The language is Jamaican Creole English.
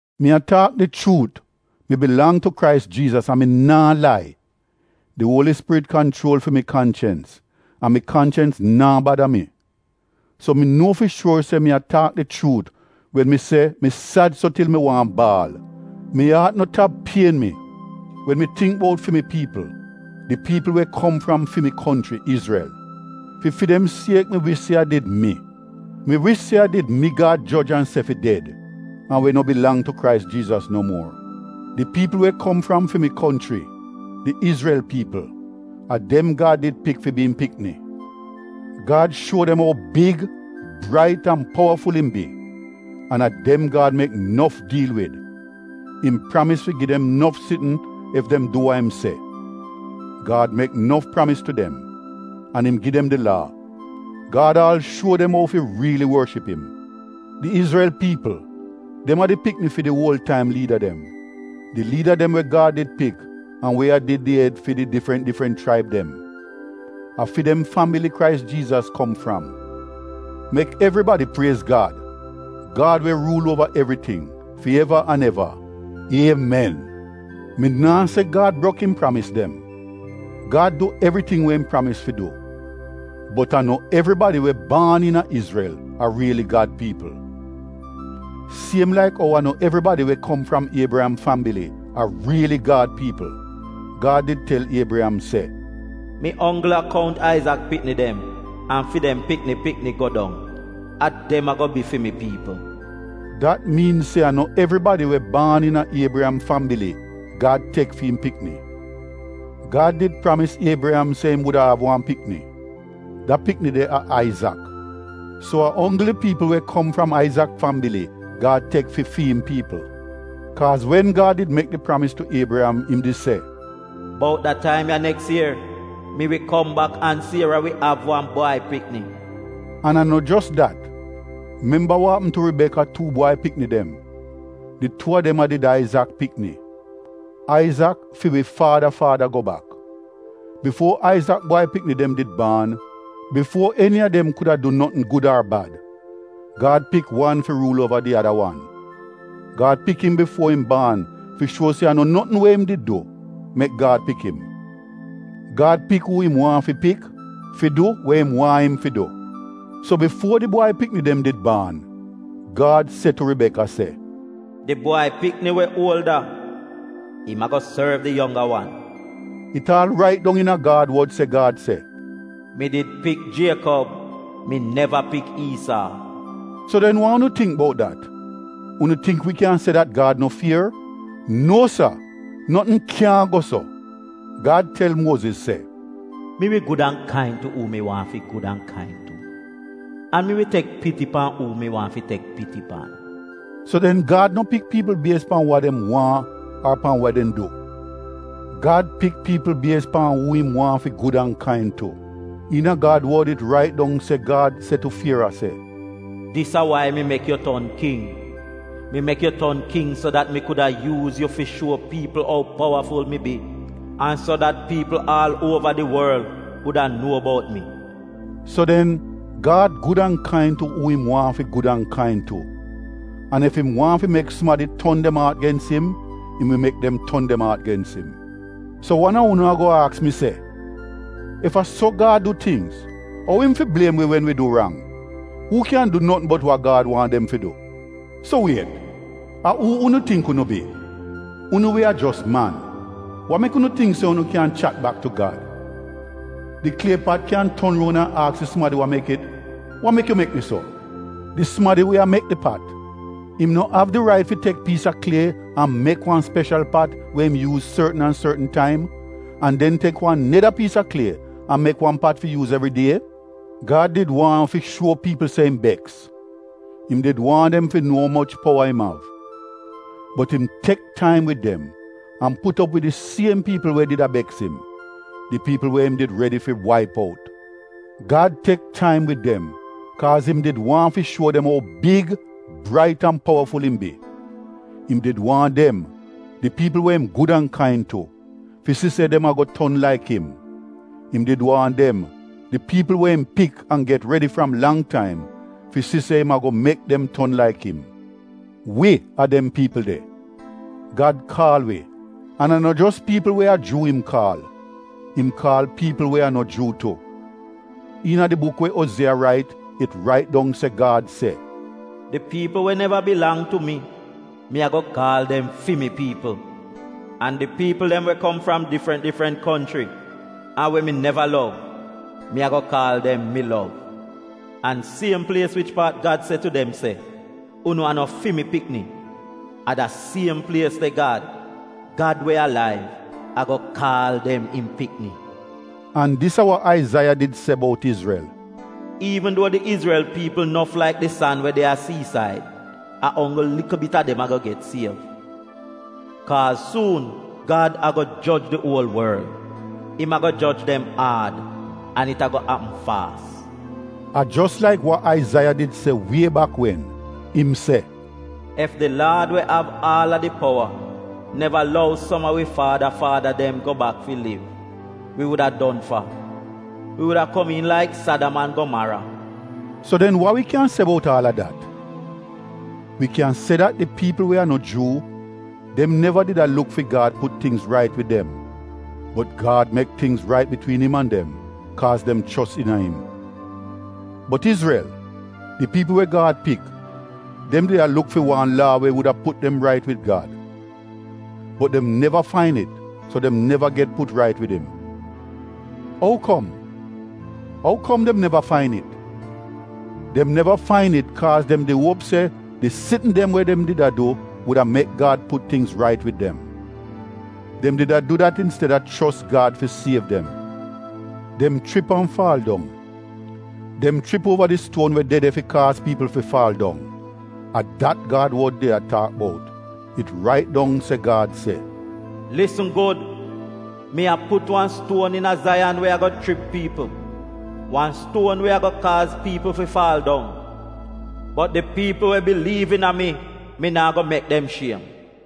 Mi a taak di chuut; mi bilang tu Krais Jiizas an mi naa lai. Di Uoli Spirit kanchuol fi mi kanchens an mi kanchens naa bada mi. So mi nuo fi shuor se mi a taak di chuut wen mi se mi sad so til mi waahn baal. Mi aat no tap pien mi wen mi tingk bout fi mi piipl, di piipl we kom fram fi mi konchri, Izrel. Fi fi dem siek mi wish se a did mi. Mi wish se a did mi Gad joj an se fi ded an we no bilang tu Krais Jiizas no muor. Di piipl we kom fram fi mi konchri, di Izrel piipl, a dem Gad did pik fi bi im pikni. Gad shuo dem ou big, brait an powaful im bi an a dem Gad mek nof diil wid — im pramis fi gi dem nof sitn ef dem du wa im se. Gad mek nof pramis tu dem, an im gi dem di Laa. Gad aal shuo dem ou fi riili worship im. Di Izrel piipl, dem a di pikni fi di uol taim liida dem — di liida dem we Gad did pik an we a did di ed fi di difrant difrant chraib dem. A fi dem fambili Krais Jiizas kom fram. Mek evribadi priez Gad, Gad we ruul uova evriting, fi eva an eva. Iemen! Mi naa se Gad brok im pramis dem — Gad du evriting we im pramis fi du, bot a no evribadi we baan iina Izrel a riili Gad piipl. Siem laik ou a no evribadi we kom fram Iebriyam fambili a riili Gad piipl. Gad did tel Iebriyam se, “Mi onggl a kount Aizak pikni dem an fi dem pikni pikni go dong, a dem ago bi fi mi piipl.” Dat miin se a no evribadi we baan iina Iebriyam fambili Gad tek fi im pikni. Gad did pramis Iebriyam se im wuda av wan pikni. Da pikni de a Aizak, so a onggl di piipl we kom fram Aizak fambili Gad tek fi fi im piipl. Kaaz wen Gad did mek di pramis tu Iebriyam im did se, “Bout da taim ya neks ier, mi wi kom bak an Siera wi av wan bwai pikni.” An a no jos dat, memba wa apm tu Ribeka tuu bwai pikni dem. Di tuu a dem a did Aizak pikni — Aizak fi wi faada faada go bak. Bifuo Aizak bwai pikni dem did baan, bifuo eni a dem kuda du notn gud ar bad, Gad pik wan fi ruul uova di ada wan. Gad pik im bifuo im baan fi shuo se a no notn we im did du mek Gad pik im — Gad pik uu im waahn fi pik fi du we im waahn im fi du. So bifuo di bwai pikni dem did baan, Gad se tu Ribeka se “Di bwai pikni we uolda, im ago sorv di yongga wan.” It aal rait dong iina Gad wod se Gad se, “Mi did pik Jiekob, mi neva pik Iisaa.” So den wa unu tingk bout dat? Unu tingk wi kyan se dat Gad no fier? Nuo Sa! Notn kyaahn go so! Gad tel Muoziz se, “Mi wi gud an kain tu uu mi waahn fi gud an kain tu, an mi wi tek piti pan uu mi waahn fi tek piti pan.” So den Gad no pik piipl bies pan wa dem waahn ar pan we dem du; Gad pik piipl bies pan uu im waahn fi gud an kain tu. Iina Gad wod it rait dong se Gad se tu Fiera se, “Dis a wai mi mek yu ton king: mi mek yu ton king so dat mi kuda yuuz yu fi shuo piipl ou powaful mi bi an so dat piipl aal uova di worl wuda nuo bout mi.” So den Gad gud an kain tu uu im waahn fi gud an kain tu an ef im waahn fi mek sumadi ton dem aat gens im, im wi mek dem ton dem aat gens im. So wan a unu ago aks mi se, “Ef a so Gad du tingz, ou im fi bliem wi wen wi du rang? Uu kyan du notn bot wa Gad waahn dem fi du?” So wiet, a uu unu tingk unu bi? Unu we a jos man, wa mek unu tingk se unu kyan chat bak tu Gad? “Di klie pat kyan ton roun an aks di sumadi we mek it, ‘Wa mek yu mek mi so?’” Di sumadi we a mek di pat, im no av di rait fi tek piis a klie an mek wan speshal pat we im yuuz sortn an sortn taim, an den tek wan neda piis a klie an mek wan pat fi yuuz evridie? Gad did waahn fi shuo piipl se im beks, im did waahn dem fi nuo umoch powa im av. Bot im tek taim wid dem an put op wid di siem piipl we did a beks im; di piipl we im did redi fi waip out. Gad tek taim wid dem kaaz im did waahn fi shuo dem ou big, brait an powaful im bi. Im did waahn dem, di piipl we im gud an kain tu, fi si se dem ago ton laik im. Im did waahn dem, di piipl we im pik an get redi fram lang taim, fi si se im ago mek dem ton laik im. Wi a dem piipl de. Gad kaal wi, an a no jos piipl we a Juu im kaal, im kaal piipl we a no Juu tu. Iina di buk we Ozieya rait, it rait dong se Gad se: “Di piipl we neva bilang tu mi, mi ago kaal dem ‘Fi mi piipl.’ An di piipl we kom fram difrant difrant konchri an we mi neva lov, mi ago kaal dem ‘Mi lov.’ An siem plies wich paat Gad se tu dem se, ‘Unu a no fi mi pikni’ a da siem plies de Gad, Gad we alaiv, ago kaal dem im pikni.” An dis a wa Aizaiya did se bout Izrel: “Iivn duo di Izrel piipl nof laik di san we de a siisaid, a onggl likl bit a dem ago get siev. Kaaz suun Gad ago joj di uol worl; im ago joj dem aad an it ago apm faas.” A jos laik wa Aizaiya did se wie bak wen. Im se: “Ef di Laad we av aal a di powa, neva lou som a wi faada faada dem go bak fi liv, wi wuda don fa. Wi wuda komiin laik Sadam an Gomara.” So den wa wi kyan se bout aal a dat? Wi kyan se dat di piipl we a no Juu, dem neva did a luk fi Gad put tingz rait wid dem, bot Gad mek tingz rait bitwiin im an dem kaaz dem chos iina im. Bot Izrel, di piipl we Gad pik, dem di a luk fi wan laa we wuda put dem rait wid Gad. Bot dem neva fain it so dem neva get put rait wid im. Ou kom? Ou kom dem neva fain it? Dem neva fain it kaaz dem di uop se di sitn dem we dem did a du wuda mek Gad put tingz rait wid dem. Dem did a du dat insteda chos Gad fi siev dem. Dem chrip an faal dong. Dem chrip uova di stuon we de de fi kaaz piipl fi faal dong. A dat Gad wod did a taak bout. It rait dong se Gad se: “Lisn Gud! Mi a put wan stuon iina Zaiyan we ago chrip piipl — wan stuon we ago kaaz piipl fi faal dong. Bot di piipl we biliiv iina mi, mi naa go mek dem shiem.”